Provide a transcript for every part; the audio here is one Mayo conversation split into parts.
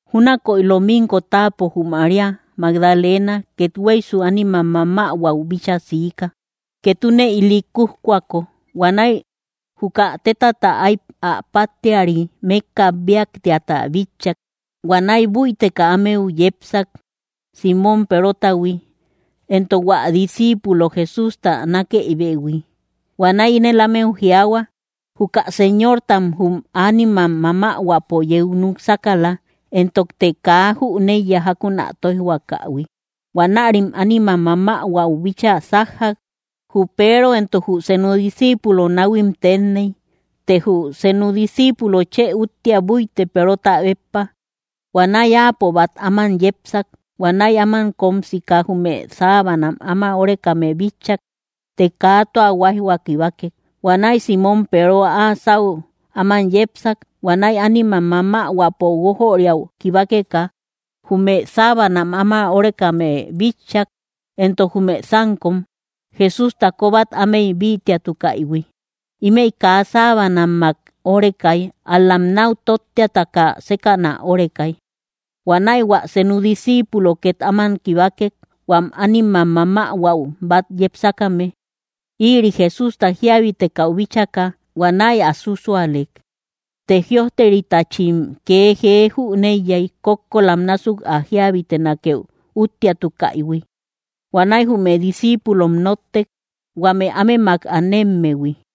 Júnakoy lominko táapo, jü María Magdalena kethueysu ánimam mamähuäu bíchaa siika, ketune ili kútkuako; huanäi juka tétata áy ä páttiari mékka bíaktiata bitchak. Huanäi búiteka ámeu yepsak Símon Perotahui, éntok huä disciipulo Jesústa nakëibehui. Huanäi ínel ámeu jiaahua: —Juka Señortam jum ánimam mamähuäpo yeu núk sákala, éntokte kaa jüneiya jákun ä tóijhuakähui. Huanärim ánimam mamähuäu bíchaa sájjak, jü Peero éntok jü senu disciipulo. Náhuim teenney, të jü senu disciipulo chë úttia búitek Perota béppa; huanäi áapo bát áman yepsak. Huanäi áman kóm sika, jume sábanam áma órekame bitchak, të kaa tua huáijhua kibakek. Huanäi Símon Peero áa sáu áman yepsak. Huanäi ánimam mamähuäpo guójöriau kibakeka, jume sábanam áma órekame bitchak; éntok jume sánkom Jesústa kóbat ámey bítiatukaïhui. Ímëi kaa sábanammak órekay, ál‑lam náu tóttiataka sékäna órekay. Huanäi hua senu disciipulo két áman kibakek, huam ánimam mamähuäu bát yepsakame. Ïri Jesústa jiabitekau bíchaka, huanäi ä súsuaalek. Të jïojteritachim kee jee jüneiyay, kókkolam násuk ä jíabitenakeu úttiatukaïhui. Huanäi jume discíipulom nóttek, huame ámemak anemmehui.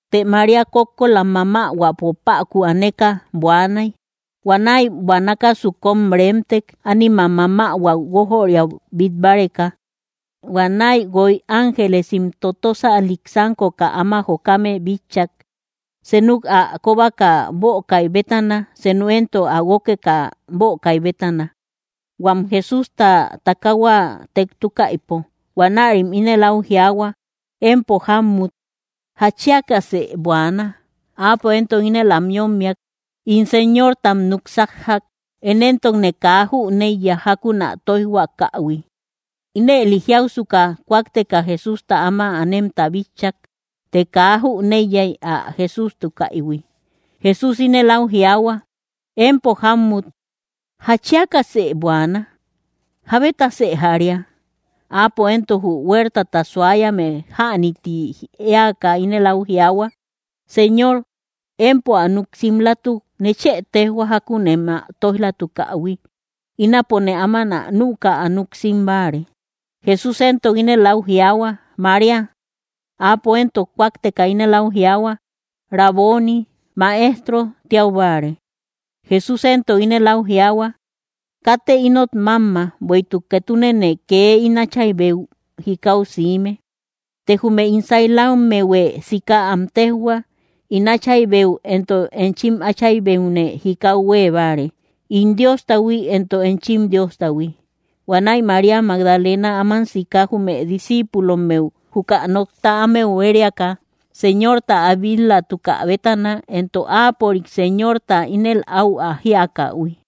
Të María, kókkolam mamähuäpo päku aneka, buaanay. Huanäi buanakasu kóm reemtek, ánimam mamähuäu guójöriau bít báreka. Huanäi guoy ángelesim totösalik sánkoka áma jokame bitchak, seenuk ä kóbaka bökai bétana, seenu éntok ä guókeka bökai bétana, huam Jesústa takaahua tektukaïpo. Huanärim ínel áu jiaahua: —Empo jámmut, ¿jatchiakasë buaana? Áapo éntok ínel am yómmiak: —In Señortam núk sájjak; én éntokne kaa jüneiya jákun ä tóijhuakähui. Ínëli jiausuka, kúakteka Jesústa áma anemta bitchak; të kaa jüneiyay ä Jesústukaïhui. Jesús ínel áu jiaahua: —Empo jámmut, ¿jatchiakasë buaana? ¿Jábetasë jaria? Áapo éntok, jü huertata suayame jäni tí eäka, ínel áu jiaahua: —Señor, empo ä núk simlatuk, nechë téjhua jákun em ä tóij‑latukähui. Ínapone áman ä nüka ä núk sim báare. Jesús éntok ínel áu jiaahua: —¡María! Áapo éntok kúakteka ínel áu jiaahua: —¡Raboni! —Maestro tiau báare. Jesús éntok ínel áu jiaahua: —Katë ínot mámma, bueïtuk ketunene kee ín Áchaybeu jikau siime. Të jume ín sailammehuë sika am téjhua: “In Áchaybeu éntok enchim Áchaybeune jikau huée báare, ín Diostahui éntok enchim Diostahui.” Huanäi María Magdalena áman siika, jume discíipulommehui, juka nokta ámeu huériaka Señorta ä bil-latukä bétana, éntok áapörik, Señorta, ínel áu jíakähui.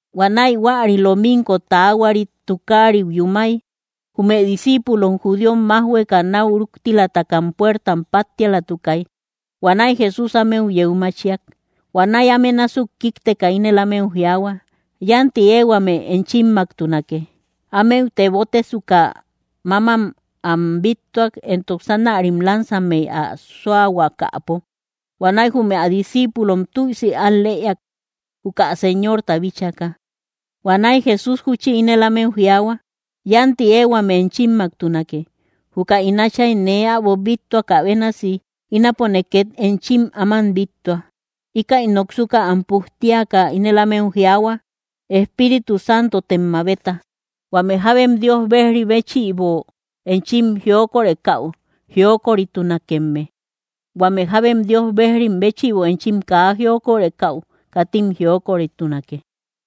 Huanäi huäri lominko taahuarit tukariu yúmay, jume discíipulom judíom májhueka náu rúktilatakam puertam páttialatukay. Huanäi Jesús ámeu yeu machiak. Huanäi áme násuk kíkteka, ínel ámeu jiaahuak: —Yánti ehuame enchimmaktunake. Ámeu tebotesuka, mámam am bíttuak, éntok sánärim lansammey ä sóahuakäpo. Huanäi jume ä discíipulom tüisi al‑lëiak, juka Señorta bíchaka. Huanäi Jesús júchi ínel ámeu jiaahua: —Yánti ehuame enchimmaktunake. Juka ín Áchay nee äbo bíttuakä bénasi, ínapone két enchim áman bíttua. Íkäi noksuka am pujtiaka, ínel ámeu jiaahua: —Espíritu Santotem mabeta. Huame jábem Dios bejri béchïbo enchim jiokorekäu jiokoritunakemme; huame jábem Dios bejrim béchïbo enchim kaa jiokorekäu, katim jiokoritunake.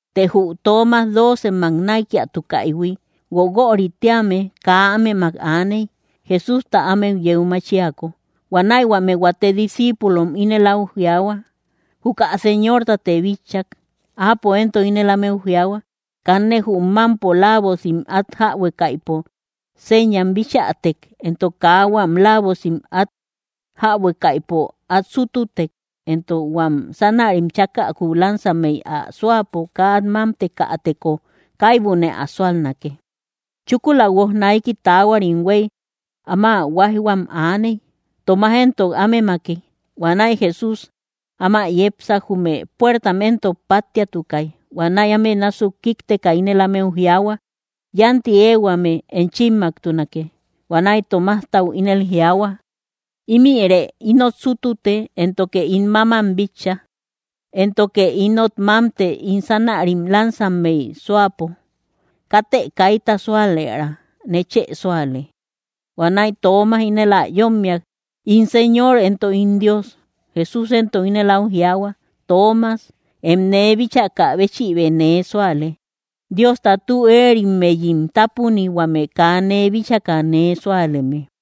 Të jü Toomas, doocemmak näikiatukaïhui, Guoguörï tíame, kaa ámemak aaney, Jesústa ámeu yeu machiako. Huanäi huame huate discíipulom ínel áu jiaahua: —Juka Señortate bitchak. Áapo éntok ínel ámeu jiaahua: —Kanne jum mámpo laavosim át jäbuekaïpo señam bichätek, éntok kaa huam laavosim át jäbuekaïpo át sútutek, éntok huam sánärim chákäku lansammey ä sóapo kaa át mámtekateko kaibune ä súalnake. Chúkula guoj naiki taahuarim huéy áma huáijhuam aaney, Toomas éntok ámemaki. Huanäi Jesús áma yepsak, jume puertam éntok páttiatukay. Huanäi áme násuk kíkteka ínel ámeu jiaahua: —Yánti ehuame enchimmaktunake. Huanäi Tomastau ínel jiaahua: —Ímïre ínot sútute, éntoke ín mámam bitcha; éntoke ínot mámte ín sánärim lansammey sóapo. Katë kaita súalëra. ¡Nechë súale! Huanäi Toomas ínel ä yómmiak: —¡In Señor, éntok ín Dios! Jesús éntok ínel áu jiaahua: —Toomas, em nee bíchakä béchïbë nee súale. ¡Diosta tü erimmeyim tápuni, huame kaa nee bíchaka nee súaleme!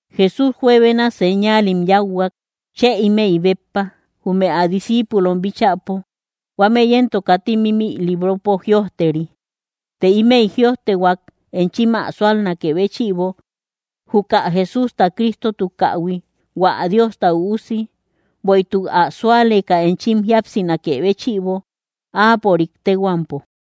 Jesús juebena señaalim yáuhuak, chë ímëi béppa, jume ä discíipulom bíchäpo; huámëi éntok katim ímï libropo jïojteri. Të ímëi jïojtehuak enchim ä súalnakë béchïbo, juka Jesústa Cristotukähui, hua Diosta Üusi, bueïtuk ä súaleka enchim jíapsinakë béchïbo, áapörik téhuampo.